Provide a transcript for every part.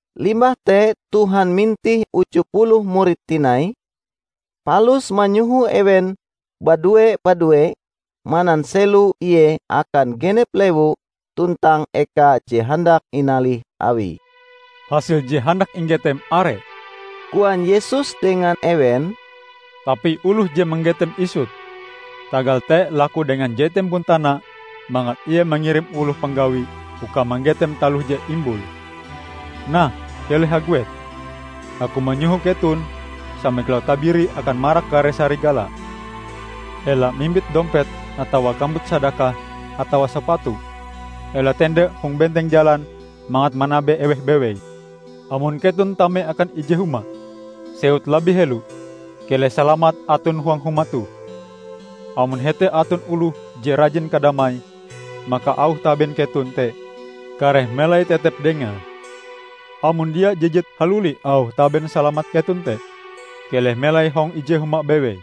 Limbah te Tuhan mintih uju puluh murid tinai, palus manyoho ewen badue-badue mananselo Ie akan genep lewu tuntang eka je handak inalih Awie. "Hasil je handak inggetem are," koan Yesus dengan ewen, "tapi oloh je manggetem isut. Tagal te laku dengan je Tempon tana mangat Ie mangirim oloh panggawi uka manggetem taloh je imbule. Nah, Keleh haguet! Aku manyoho keton sama kilau tabiri akan marak kare sarigala. Ela mimbit dompet atawa kambut sadakah atawa sapatu. Ela tende hong benteng jalan mangat manabe eweh bewei. Amon keton tame akan ije huma, sewut labih helo, 'Keleh salamat aton huang huma toh.' Amon hete aton oloh je rajin kadamai maka auh taben keton te kareh melai tetep dengae; amon dia jijit haluli auh taben salamat keton te. Keleh melai hong ije huma bewei.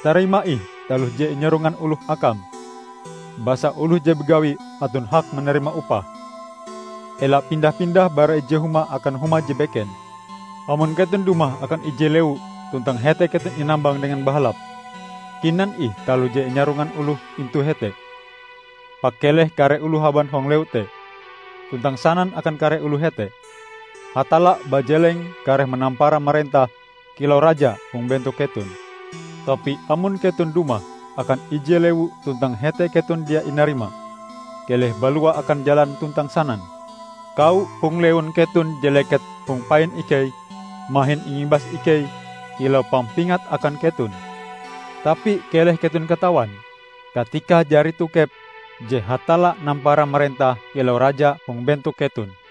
Tarima ih taloh je inyarongan oloh akam, basa oloh je bagawi aton hak manarima upahe. Ela pindah-pindah bara ije huma akan huma je beken. Amon keton dumah akan ije lewu tuntang hete keton inambang dengan bahalap, kinan ih taloh je inyarongan oloh intu hete. Pakeleh kare oloh haban hong lewu te, tuntang sanan akan kare oloh hete, 'Hatalla bajeleng kareh manampara marentah kilau Raja hong bentok keton.' Tapi amon keton dumah akan ije lewu tuntang hete keton dia inarima, keleh balua akan jalan tuntang sanan, 'Kawo hong lewun keton je leket hong pain ikei mahin ingibas ikei kilau pampingat akan keton. Tapi keleh keton katawan katikae jari tokep je Hatalla nampara marentah kilau Raja hong bentok keton!'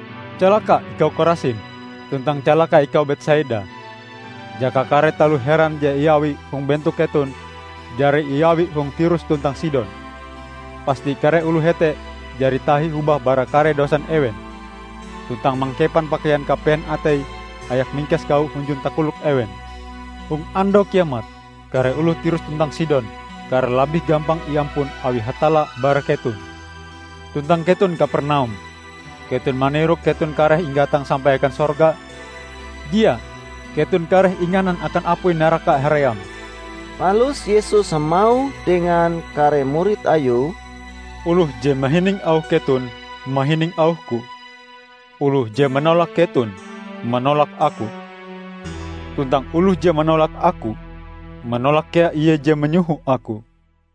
"Calaka ikau Korasim! Tuntang calaka ikau, Betsaida! Jaka kare taloh heran je iawi hong bentok keton jari iawi hong Tirus tuntang Sidon, pasti kare oloh hete jari tahi hobah bara kare dosan ewen, tuntang mangkepan pakaian kapehen atei hayak mingkes kawo hunjun takolok ewen. Hong Andau Kiamat, kare oloh Tirus tuntang Sidon kareh labih gampang iampun awi Hatalla bara keton. Tuntang keton, Kapernaum! Keton manirok keton kareh inggatang sampai akan sorga? Dia! Keton kareh inganan akan apui naraka haream!" Palus Yesus hamauh dengan kare murid Ayue, "Oloh je mahining auh keton, mahining auh-Ku. Oloh je manolak keton, manolak Aku. Tuntang oloh je manolak Aku, manolak kea Ie je manyoho Aku."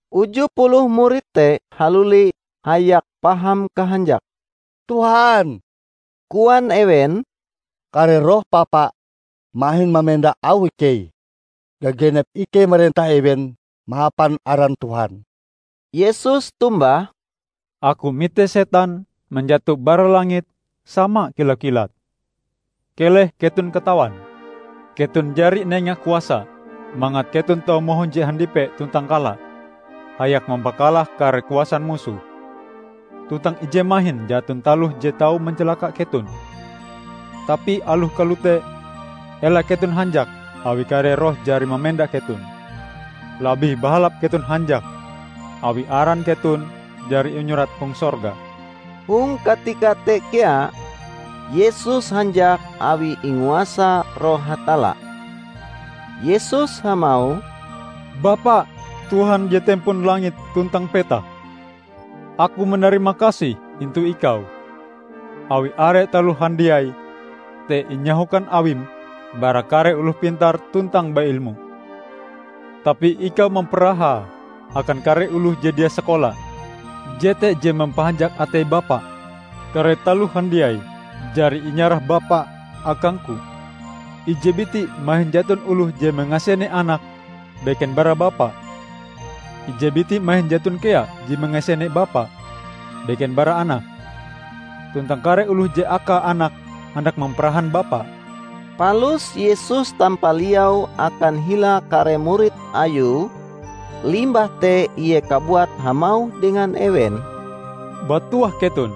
Uju puluh murid te haluli hayak paham kahanjake. "Tuhan," koan ewen, "kare roh papa mahin mamenda auh ikei gagenep ikei marentah ewen mahapan aran Tuhan!" Yesus tombah, "Aku mite setan manjato bara langit sama kilau kilat. Keleh keton katawan! Keton jari inenga kuasa mangat keton tau mahunje handipe tuntang kala hayak mampakalah kare kuasan musoh, tuntang ije mahin jaton taloh je tau mancalaka keton. Tapi aloh kalote ela keton hanjak awi kare roh jari mamenda keton. Labih bahalap keton hanjak awi aran keton jari inyurat hong sorga." Hong katika te kea, Yesus hanjak awi inguasa Roh Hatalla. Yesus hamauh, "Bapa, Tuhan je tempon langit tuntang petak! Aku manarimakasih intu Ikau awi are taloh handiai te inyahokan Awim bara kare oloh pintar tuntang ba-ilmu, tapi Ikau mamparahae akan kare oloh je dia sakola. Jete je mampahanjak atei Bapa. Kare taloh handiai jari inyarah Bapa akang-Ku. Ije biti mahin jaton oloh je mangasene Anak, beken bara Bapa. Ije biti mahin jaton kea je mangasene Bapa, beken bara Anak; tuntang kare oloh je akae Anak handak mamparahan Bapa." Palus Yesus tampaliau akan hila kare murid Ayue, limbah te Ie kabuat hamauh dengan ewen, "Batuah keton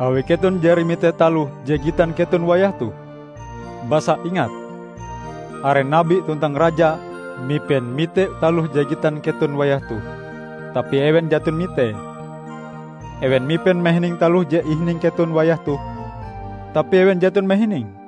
awi keton jari mite taloh je gitan keton wayah toh. Basa ingat: Are Nabi tuntang raja mipen mite taloh je gitan keton wayah toh tapi ewen jaton mitee. Ewen mipen mahining taloh je ihining keton wayah toh, tapi ewen jaton mahininge."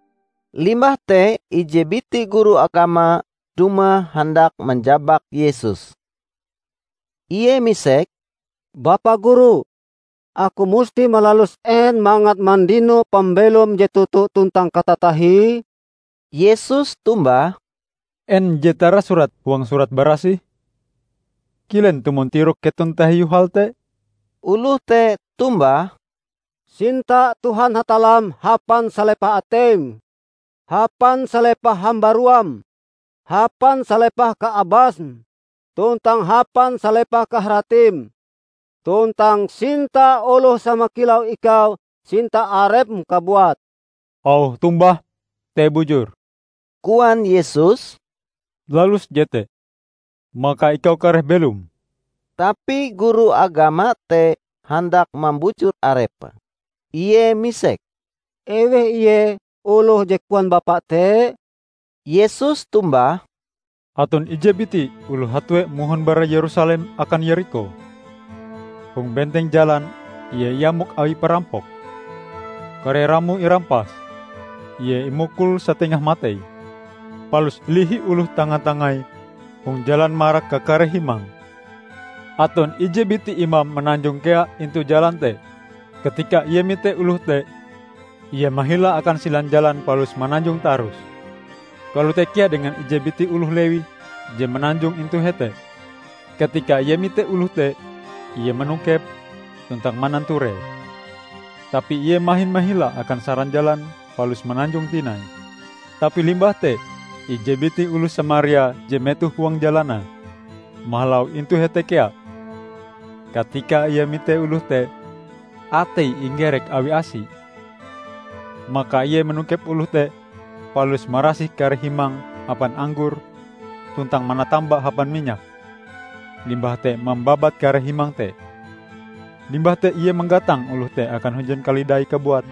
Limbah te ije biti guru agama dumah handak manjabak Yesus. Ie misek, "Bapa Guru, aku musti malalus en mangat mandino pambelom je toto tuntang katatahie?" Yesus tombah, "En je tarasurat huang Surat Barasih? Kilen tumon tirok keton tahiu hal te?" Oloh te tombah, " 'Sinta Tuhan Hatallam hapan salepah ateim, hapan salepah hambaruam, hapan salepah kaabasm, tuntang hapan salepah kaharatim,' tuntang 'Sinta oloh sama kilau ikau sinta arepm kabuat.' " "Auh tombahm te bujur," koan Yesus, "Lalus jete, maka ikau kareh belom." Tapi guru agama te handak mambujur arepe. Ie misek, "Eweh ie oloh je koan Bapa te?" Yesus tombah, "Aton ije biti oloh hatue mohon bara Yerusalem akan Yerikho. Hong benteng jalan ie iamok awi parampok, kare ramoe irampas, ie imukul satengah matei, palus ilihi oloh tanga-tangai hong jalan marak kakare himange. Aton ije biti imam mananjong kea intu jalan te. Katika ie mite oloh te, ie mahila akan silan jalan palus mananjong tarus. Kalote kea dengan ije biti oloh Lewi je mananjong intu hete; katika ie mite oloh te, ie manokepe tuntang mananturee. Tapi ie mahin mahila akan saran jalan palus mananjong tinai. Tapi limbah te ije biti oloh Samaria je metoh huang jalanae, mahalau intu hete kea, katika ie mite oloh te, ateie inggerek awi asie. Maka ie manokep oloh te palus marasih kare himange hapan anggor tuntang manatamba hapan minyak, limbah te mambabat kare himang te. Limbah te ie manggatang oloh te akan hunjun kalidaie kabuat,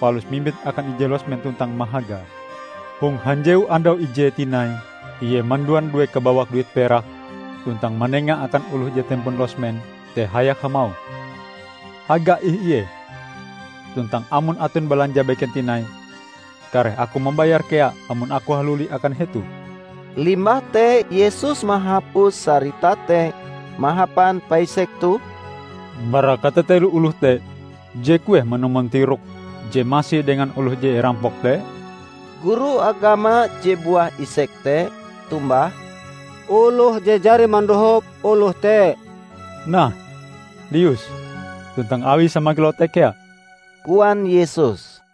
palus mimbite akan ije losmen tuntang mahagae. Hong hanjewu andau ijee tinai ie manduan due kabawak duit perak tuntang manenga akan oloh je tempon losmen te hayak hamauh, 'Haga ih ie, tuntang amon aton balanja beken tinai, kareh aku mambayare kea amon aku haluli akan hetoh.' " Limbah te Yesus mahapus sarita te mahapan paisek toh, "Bara katatelo oloh te, je kueh manumon tirokm je masi dengan oloh je irampok te?" Guru agama je buah isek te tombah, "Oloh je jari mandohop oloh te." "Nah, lius, tuntang awi sama kilau te kea!" koan Yesus.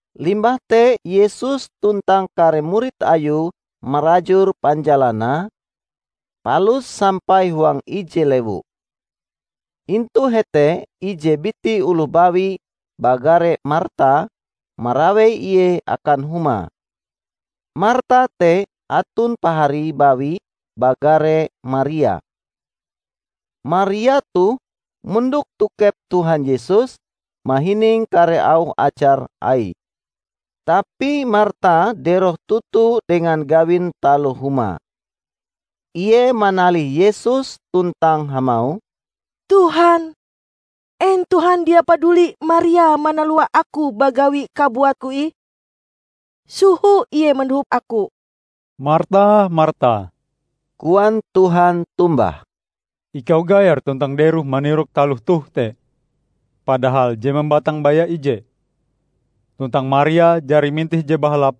Limbah te Yesus tuntang kare murid Ayue marajur panjalanae, palus sampai huang ije lewu. Intu hete ije biti oloh bawi bagare Marta marawei ie akan humae. Marta te aton paharie bawi bagare Maria. Maria toh mondok tokep Tuhan Yesus mahining kare auh ajar Aie. Tapi Marta deroh toto dengan gawin taloh humae. Ie manalih Yesus tuntang hamauh, "Tuhan, en Tuhan dia paduli Maria manalua aku bagawi kabuatku ih? Soho ie mandohop aku!" "Marta, Marta!" koan Tuhan tombah. "Ikau gaer tuntang deroh manirok taloh toh te; padahal je mambatang baya ije. Tuntang Maria jari mintih je bahalap,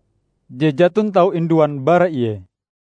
je jaton tau induan bara ie."